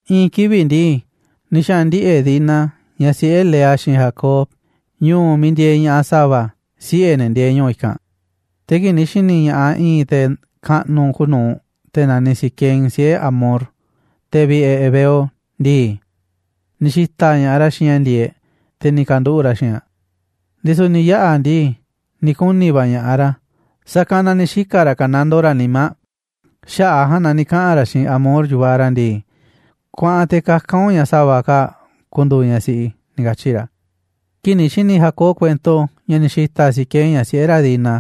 I̱i̱n kivi̱ꞌ ndii, ni̱ xaꞌa̱n ndiꞌe̱ꞌ Dina, ñaꞌ siꞌe̱ Lea xiinꞌ Jacob, ñu̱u̱ miiꞌ ndieeꞌ ña̱ꞌaꞌ sa̱va̱, siꞌe̱ ne̱ ndieeꞌ ñu̱u̱ i̱kanꞌ. Te̱ kii̱ꞌ ni̱ xi̱ni̱ ña̱ꞌaꞌ i̱i̱n te̱ kaꞌnuꞌ kuuꞌ nuu̱ꞌ, te̱ naniꞌ Siquem, siꞌe̱ Hamor, te̱ vi̱ꞌe̱ heveo ndii, ni̱ xi̱ta̱ꞌ ña̱ꞌaꞌ ra̱ xiinꞌ ña̱ ndi̱e̱eꞌ, te̱ ni̱ ka̱nduꞌu̱ꞌ ra̱ xiinꞌ aꞌ. Ndisu̱ ni̱ yaꞌa̱ ndii, ni̱ kuni̱ va̱ ña̱ꞌaꞌ ra̱, sa̱kanꞌ na ni̱ xika̱ ra̱ ka̱nandoo ra̱ nimá aꞌ. Xaꞌa̱ꞌ a̱ ja̱a̱nꞌ ni̱ kaꞌa̱n ra̱ xiinꞌ Hamor, yu̱vaꞌ ra̱ ndii: ―Kuaꞌan te̱ kaka̱n u̱nꞌ ña̱ sa̱va̱ kaa̱ꞌ ku̱ndu̱u̱ ñaꞌ siꞌi i̱ ―ni̱ katyi̱ ra̱. Kii̱ꞌ ni̱ xi̱ni̱ Jacob kuento ña̱ ni̱ xi̱ta̱ꞌ Siquem ñaꞌ siꞌe̱ ra̱ Dina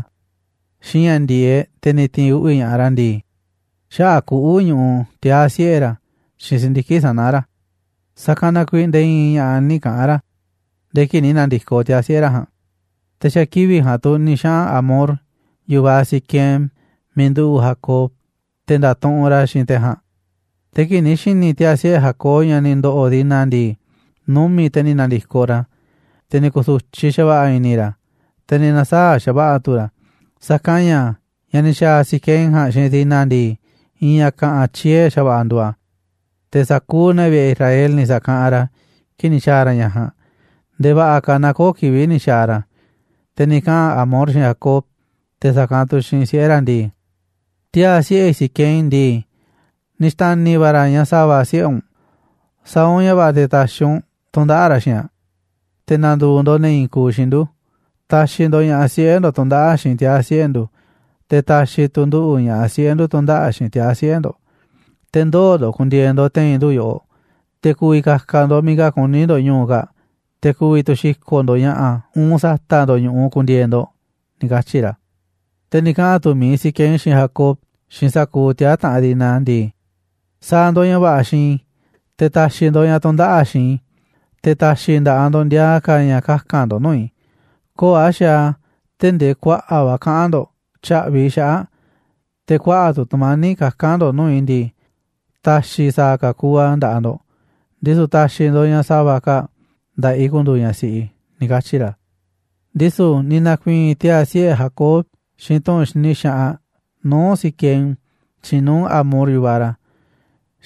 xiinꞌ ña̱ ndi̱e̱eꞌ, te̱ ni̱ ti̱i̱n uꞌvi̱ ña̱ꞌaꞌ ra̱ ndii, xaꞌa̱ꞌ kuꞌu̱ ñuꞌuꞌ tiaa̱ siꞌe̱ ra̱ xiinꞌ si̱ndiki̱ꞌ sana̱ ra̱, sa̱kanꞌ na kuiiꞌ nde̱e̱ i̱i̱n ña̱ꞌa̱ nï̱ kaꞌa̱n ra̱ nde̱e̱ kii̱ꞌ ni̱ na̱ndi̱koꞌ tiaa̱ siꞌe̱ ra̱ ja̱a̱nꞌ. Te̱ xa̱ kivi̱ꞌ ja̱a̱nꞌ tu̱ ni̱ xaꞌa̱n Hamor, yu̱vaꞌ Siquem, miiꞌ nduꞌu̱ꞌ Jacob, te̱ nda̱tuꞌunꞌ ra̱ xiinꞌ te̱ ja̱a̱nꞌ. Te̱ kii̱ꞌ ni̱ xi̱ni̱ tiaa̱ siꞌe̱ Jacob ña̱ ni̱ ndo̱ꞌo̱ Dina ndii, numi̱ꞌ te̱ ni̱ na̱ndi̱koꞌ ra̱, te̱ ni̱ ku̱su̱tyiꞌ xa̱va̱ꞌa̱ i̱ni̱ ra̱, te̱ ni̱ na̱saa̱ꞌ xa̱va̱ꞌa̱ tu̱ ra̱, sa̱kanꞌ ña̱ ña̱ ni̱ xa̱a̱ Siquem ja̱a̱nꞌ xiinꞌ Dina ndii, i̱i̱n ña̱ ka̱ꞌa̱n tyie̱ xa̱va̱ꞌa̱ nduuꞌ a̱, te̱ sa̱kuuꞌ ne̱ vi̱ꞌe̱ Israel ni̱ sa̱kaꞌanꞌ ra̱ kii̱ꞌ ni̱ xa̱a̱ ra̱ ña̱ ja̱a̱nꞌ, nde̱e̱ va̱ꞌa̱ ka̱ naaꞌ köo̱ꞌ kivi̱ꞌ ni̱ xaaꞌ ra̱ a̱. Te̱ ni̱ kaꞌa̱n Hamor xiinꞌ Jacob, te̱ sa̱kanꞌ tu̱ xiinꞌ siꞌe̱ ra̱ ndii: ―Tiaa̱ siꞌe̱ i̱ Siquem ndii, ni̱ xta̱ni̱ va̱ ra̱ ñaꞌ sa̱va̱ siꞌe̱ u̱nꞌ, sa̱a̱ u̱nꞌ ña̱ va̱ꞌa̱ te̱ ta̱xi̱ u̱nꞌ tu̱ndaꞌa̱ꞌ ra̱ xiinꞌ aꞌ. Te̱ na̱ndu̱u̱ ndo̱ꞌ ne̱ i̱i̱n kuuꞌ xiinꞌ ndu̱, ta̱xi̱ ndo̱ꞌ ña̱ꞌaꞌ siꞌe̱ ndo̱ꞌ tu̱ndaꞌa̱ꞌ xiinꞌ tiaa̱ siꞌe̱ ndu̱, te̱ ta̱xi̱ tu̱ nduꞌu̱ ña̱ꞌaꞌ siꞌe̱ ndu̱ tu̱ndaꞌa̱ꞌ xiinꞌ tiaa̱ siꞌe̱ ndo̱ꞌ. Te̱ ndoo̱ ndo̱ꞌ ku̱ndi̱e̱e̱ ndo̱ꞌ te̱i̱n ndu̱ yoꞌoꞌ, te̱ ku̱vi̱ ka̱ka̱ ndo̱ꞌ miiꞌ ka̱ kuní ndo̱ꞌ ñu̱u̱ kaa̱ꞌ, te̱ ku̱vi̱ tu̱ xi̱ko̱ꞌ ndo̱ꞌ ña̱ꞌa̱, uun sa̱ta̱ꞌ ndo̱ꞌ ñu̱ꞌuꞌ ku̱ndi̱e̱e̱ ndo̱ꞌ ―ni̱ katyi̱ ra̱. Te̱ ni̱ kaꞌa̱n tu̱ mi̱iꞌ Siquem xiinꞌ Jacob, xiinꞌ sa̱kuuꞌ tiaa̱ taꞌanꞌ Dina ndii: ―Sa̱a̱ ndo̱ꞌ ña̱ va̱ꞌa̱ xiinꞌ i̱, te̱ ta̱xi̱ ndo̱ꞌ ña̱ tu̱ndaꞌa̱ꞌ aꞌ xiinꞌ i̱, te̱ ta̱xi̱ i̱ nda̱ꞌaꞌ ndo̱ꞌ ndiaa ka̱ ña̱ kaka̱n ndo̱ꞌ nuu̱ꞌ i̱. Köo̱ꞌ a̱ xaaꞌ a̱ tee̱ꞌ ndee kuaꞌa̱ꞌ va̱ kaꞌa̱n ndo̱ꞌ tya̱ꞌvi̱ i̱ xaꞌa̱ꞌ aꞌ, te̱ kuaꞌa̱ꞌ tu̱ tu̱mani̱ꞌ kaka̱n ndo̱ꞌ nuu̱ꞌ i̱ ndii, ta̱xi̱ sa̱a̱ ka̱ kuuꞌ a̱ nda̱ꞌaꞌ ndo̱ꞌ, ndisu̱ ta̱xi̱ ndo̱ꞌ ñaꞌ sa̱va̱ kaa̱ꞌ nda̱ꞌaꞌ i̱ ku̱ndu̱u̱ ñaꞌ siꞌi i̱ ―ni̱ katyi̱ ra̱. Ndisu̱ ni̱ na̱ku̱i̱i̱n tiaa̱ siꞌe̱ Jacob xiinꞌ tu̱ꞌu̱n xini xaꞌanꞌ nuu̱ꞌ Siquem, xiinꞌ nuu̱ꞌ Hamor, yu̱vaꞌ ra̱,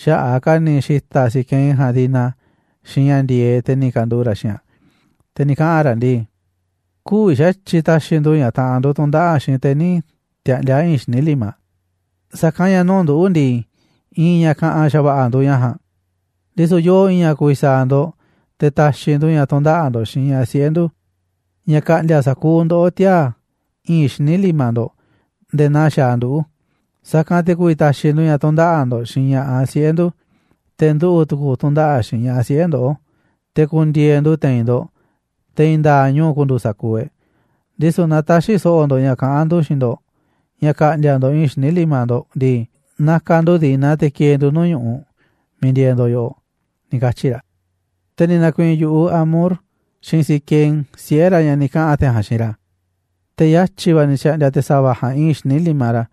xaꞌa̱ꞌ a̱ ka̱ ni̱ xi̱ta̱ꞌ Siquem ja̱a̱nꞌ Dina xiinꞌ ña̱ ndi̱e̱eꞌ, te̱ ni̱ ka̱nduꞌu̱ꞌ ra̱ xiinꞌ aꞌ. Te̱ ni̱ kaꞌa̱n ra̱ ndii: ―Kü̱vi̱ xa̱tyiꞌ ta̱xi̱ ndu̱ ñaꞌ taꞌanꞌ ndu̱ tu̱ndaꞌa̱ꞌ xiinꞌ te̱ nï̱ tiaꞌndi̱a̱ i̱i̱nꞌ xíniꞌ limaꞌ, sa̱kanꞌ ña̱ nuu̱ꞌ nduꞌu̱ ndii, i̱i̱n ña̱ ka̱ꞌa̱n xa̱va̱ꞌa̱ nduuꞌ ña̱ ja̱a̱nꞌ. Ndisu̱ yoo i̱i̱n ña̱ ku̱vi̱ sa̱a̱ ndo̱ꞌ te̱ ta̱xi̱ ndu̱ ña̱ tu̱ndaꞌa̱ꞌ ndo̱ꞌ xiinꞌ ña̱ꞌaꞌ siꞌe̱ ndu̱, ña̱ ka̱ꞌndi̱a̱ sa̱kuuꞌ ndoꞌó tiaa̱ i̱i̱nꞌ xíniꞌ limaꞌ ndo̱ꞌ nde̱e̱ naa xaaꞌ nduꞌu̱. Sa̱kanꞌ te̱ ku̱vi̱ ta̱xi̱ ndu̱ ña̱ tu̱ndaꞌa̱ꞌ ndo̱ꞌ xiinꞌ ña̱ꞌaꞌ siꞌe̱ ndu̱, te̱ nduꞌu̱ tu̱ku̱ tu̱ndaꞌa̱ꞌ xiinꞌ ña̱ꞌaꞌ siꞌe̱ ndoꞌó, te̱ ku̱ndi̱e̱e̱ ndu̱ te̱i̱n ndo̱ꞌ, te̱ i̱i̱n nda̱a̱ꞌ ñu̱u̱ ku̱ndu̱u̱ sa̱kuuꞌ e̱ꞌ. Ndisu̱ naaꞌ tä̱xi̱ so̱ꞌo̱ ndo̱ꞌ ña̱ kaꞌán ndu̱ xiinꞌ ndo̱ꞌ ña̱ ka̱ꞌndi̱a̱ ndo̱ꞌ i̱i̱nꞌ xíniꞌ limaꞌ ndo̱ꞌ ndii, na̱ka̱ ndu̱ Dina te̱ ki̱e̱e̱ ndu̱ nuu̱ꞌ ñu̱ꞌuꞌ miiꞌ ndieeꞌ ndo̱ꞌ yoꞌoꞌ ―ni̱ katyi̱ ra̱. Te̱ ni̱ na̱ku̱i̱i̱n yu̱ꞌuꞌ Hamor xiinꞌ Siquem, siꞌe̱ ra̱, ña̱ ni̱ kaꞌa̱n te̱ ja̱a̱nꞌ xiinꞌ ra̱. Te̱ yatyi̱ va̱ ni̱ xa̱ꞌndi̱a̱ te̱ sa̱va̱ ja̱a̱nꞌ i̱i̱nꞌ xíniꞌ limaꞌ ra̱,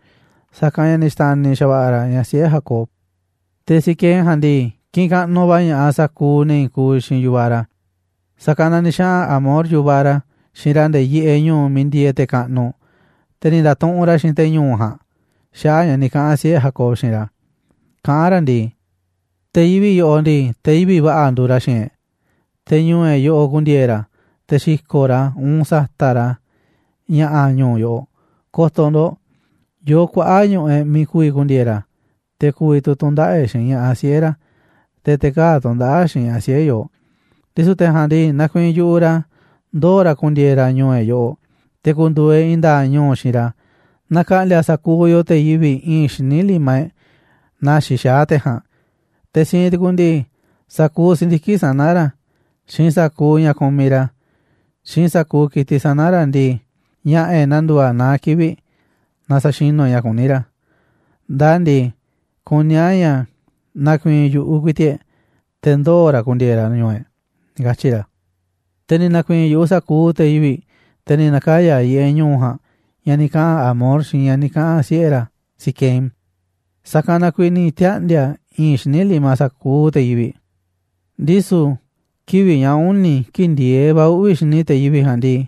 sa̱kanꞌ ña̱ ni̱ xta̱ni̱ xa̱va̱ꞌa̱ ra̱ ñaꞌ siꞌe̱ Jacob. Te̱ Siquem ja̱a̱nꞌ ndii, kiꞌinꞌ kaꞌnuꞌ va̱ ña̱ꞌaꞌ sa̱kuuꞌ ne̱ i̱i̱n kuuꞌ xiinꞌ yu̱vaꞌ ra̱. Sa̱kanꞌ na ni̱ xaꞌa̱n Hamor, yu̱vaꞌ ra̱, xiinꞌ ra̱ nde̱e̱ yiꞌeꞌ ñu̱u̱ miiꞌ ndieeꞌ te̱ kaꞌnuꞌ, te̱ ni̱ nda̱tuꞌunꞌ ra̱ xiinꞌ te̱ ñu̱u̱ ja̱a̱nꞌ xaꞌa̱ꞌ ña̱ ni̱ kaꞌa̱n siꞌe̱ Jacob xiinꞌ ra̱. Kaꞌán ra̱ ndii: ―Te̱ yivi̱ꞌ yoꞌoꞌ ndii, te̱ yivi̱ꞌ va̱ꞌa̱ nduuꞌ ra̱ xiinꞌ e̱ꞌ, te̱ ñu̱u̱ e̱ꞌ yoꞌoꞌ ku̱ndi̱e̱e̱ ra̱, te̱ xi̱ko̱ꞌ ra̱, uun sa̱ta̱ꞌ ra̱ ña̱ꞌa̱ ñu̱u̱ yo̱ꞌo̱. Ko̱to̱ ndo̱ꞌ, yoo kuaꞌa̱ꞌ ñu̱ꞌuꞌ e̱ꞌ miiꞌ ku̱vi̱ ku̱ndi̱e̱e̱ ra̱, te̱ ku̱vi̱ tu̱ tu̱ndaꞌa̱ꞌ e̱ꞌ xiinꞌ ña̱ꞌaꞌ siꞌe̱ ra̱, te̱ te̱ kaa̱ꞌ tu̱ndaꞌa̱ꞌ xiinꞌ ña̱ꞌaꞌ siꞌe̱ yooꞌ. Ndisu̱ te̱ ja̱a̱nꞌ ndii, nakuiinꞌ yu̱ꞌuꞌ ra̱ ndoo̱ ra̱ ku̱ndi̱e̱e̱ ra̱ ñu̱u̱ e̱ꞌ yoꞌoꞌ, te̱ ku̱ndu̱u̱ e̱ꞌ i̱i̱n nda̱a̱ꞌ ñu̱u xiinꞌ ra̱, naaꞌ ka̱ꞌndi̱a̱ sa̱kuuꞌ yoo te̱ yivi̱ꞌ i̱i̱nꞌ xíniꞌ limaꞌ e̱ꞌ naa xixaá te̱ ja̱a̱nꞌ. Te̱ siinꞌ tu̱ku̱ ndii, sa̱kuuꞌ si̱ndiki̱ꞌ sana̱ ra̱, xiinꞌ sa̱kuuꞌ ña̱ kumiꞌ ra̱, xiinꞌ sa̱kuuꞌ ki̱tiꞌ sana̱ ra̱ ndii, ña̱ꞌa̱ e̱ꞌ na̱ndu̱u̱ a̱ naá kivi̱ꞌ naaꞌ sa̱xinu̱ e̱ꞌ ña̱ kuní ra̱. Ndaa ndii, kuní a̱ ña̱ na̱ku̱i̱i̱n yu̱ꞌuꞌ ku̱i̱ti̱ꞌ e̱ꞌ te̱ ndoo̱ ra̱ ku̱ndi̱e̱e̱ ra̱ ñu̱u̱ e̱ꞌ ―ni̱ katyi̱ ra̱. Te̱ ni̱ na̱ku̱i̱i̱n yu̱ꞌuꞌ sa̱kuuꞌ te̱ yivi̱ꞌ, te̱ ni̱ na̱kaya̱ yiꞌeꞌ ñu̱u̱ ja̱a̱nꞌ ña̱ ni̱ kaꞌa̱n Hamor xiinꞌ ña̱ ni̱ kaꞌa̱n siꞌe̱ ra̱ Siquem, sa̱kanꞌ na kuiiꞌ ni̱ tiaꞌndi̱a̱ i̱i̱nꞌ xíniꞌ limaꞌ sa̱kuuꞌ te̱ yivi̱ꞌ. Ndisu̱ kivi̱ꞌ ña̱ uni̱ kii̱ꞌ ndi̱e̱eꞌ ka̱ uꞌvi̱ xini te̱ yivi̱ꞌ ja̱a̱nꞌ ndii,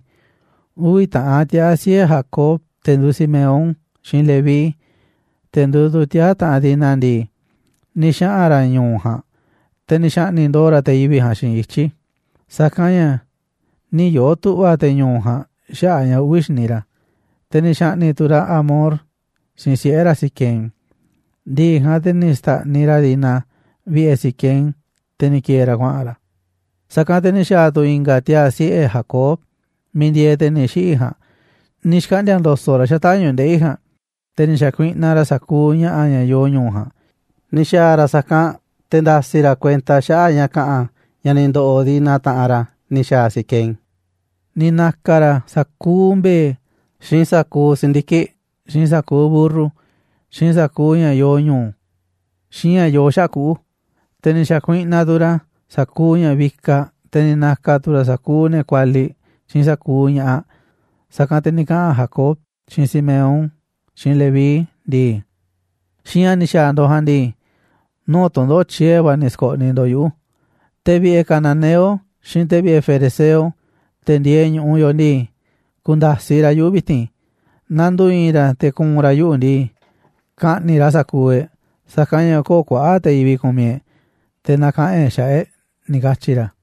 uvi̱ taꞌan tiaa̱ siꞌe̱ Jacob, te̱ nduuꞌ Simeón, xiinꞌ Leví, te̱ nduuꞌ tu̱ tiaa̱ taꞌanꞌ Dina ndii, ni̱ xaꞌa̱n ra̱ ñu̱u̱ ja̱a̱nꞌ, te̱ ni̱ xa̱ꞌni̱ꞌ ndo̱o̱ ra̱ te̱ yivi̱ꞌ ja̱a̱nꞌ xiinꞌ ityi̱, sa̱kanꞌ ña̱ nï̱ yoo̱ tu̱ꞌva̱ te̱ ñu̱u̱ ja̱a̱nꞌ xaꞌa̱ꞌ ña̱ uꞌvi̱ xini ra̱. Te̱ ni̱ xa̱ꞌni̱ꞌ tu̱ ra̱ Hamor xiinꞌ siꞌe̱ ra̱ Siquem, ndi̱ꞌi̱ ja̱a̱nꞌ, te̱ ni̱ xta̱ꞌniꞌ ra̱ Dina vi̱ꞌe̱ Siquem, te̱ ni̱ ki̱e̱e̱ ra̱ kuaꞌa̱n ra̱. Sa̱kanꞌ te̱ ni̱ xa̱a̱ tu̱ i̱nga̱ tiaa̱ siꞌe̱ Jacob miiꞌ ndieeꞌ te̱ ni̱ xiꞌi̱ ja̱a̱nꞌ, ni̱ xkaꞌndi̱a̱ ndo̱so̱ꞌ ra̱ xata̱ꞌ ñu̱ꞌuꞌ ndeꞌi̱ ja̱a̱nꞌ, te̱ ni̱ xa̱kuiꞌnaꞌ ra̱ sa̱kuuꞌ ña̱ꞌa̱ ña̱ yoo ñu̱u̱ ja̱a̱nꞌ, ni̱ xa̱a̱ ra̱ sa̱kanꞌ te̱ nda̱si̱ ra̱ kuenta xaꞌa̱ꞌ ña̱ ka̱ꞌa̱n ña̱ ni̱ xa̱a̱ Siquem xiinꞌ Dina, taꞌanꞌ ra̱. Ni̱ na̱ka̱ ra̱ sa̱kuuꞌ mbe̱e̱, xiinꞌ sa̱kuuꞌ si̱ndiki̱ꞌ, xiinꞌ sa̱kuuꞌ mburru, xiinꞌ sa̱kuuꞌ ña̱ yoo ñu̱u̱, xiinꞌ ña̱ yoo xaꞌa̱ꞌ kuꞌu̱. Te̱ ni̱ xa̱kuiꞌnaꞌ tu̱ ra̱ sa̱kuuꞌ ña̱ vikaꞌ, te̱ ni̱ na̱ka̱ tu̱ ra̱ sa̱kuuꞌ ne̱ kualiꞌ xiinꞌ sa̱kuuꞌ ña̱ꞌaꞌ. Sa̱kanꞌ te̱ ni̱ kaꞌa̱n Jacob xiinꞌ Simeón xiinꞌ Leví ndii: ―Xiinꞌ ña̱ ni̱ xa̱a̱ ndo̱ꞌ ja̱a̱nꞌ ndii, nuu̱ꞌ tu̱ndoꞌo̱ꞌ tyie̱ va̱ ni̱ sko̱ꞌniꞌ ndo̱ꞌ yuꞌu̱. Te̱ vi̱ꞌe̱ cananeo xiinꞌ te̱ vi̱ꞌe̱ ferezeo, te̱ ndieeꞌ ñu̱ꞌuꞌ yoꞌoꞌ ndii, ku̱nda̱siꞌ ra̱ yuꞌu̱ vi̱ti̱n. Naaꞌ ndu̱u̱ i̱i̱n ra̱ te̱ ku̱u̱n ra̱ yuꞌu̱ ndii, ka̱ꞌni̱ꞌ ra̱ sa̱kuuꞌ e̱ꞌ, sa̱kanꞌ ña̱ köo̱ꞌ kuaꞌa̱ꞌ te̱ yivi̱ꞌ kumiꞌ e̱ꞌ te̱ na̱kaꞌa̱n e̱ꞌ xaꞌa̱ꞌ e̱ꞌ ―ni̱ katyi̱ ra̱.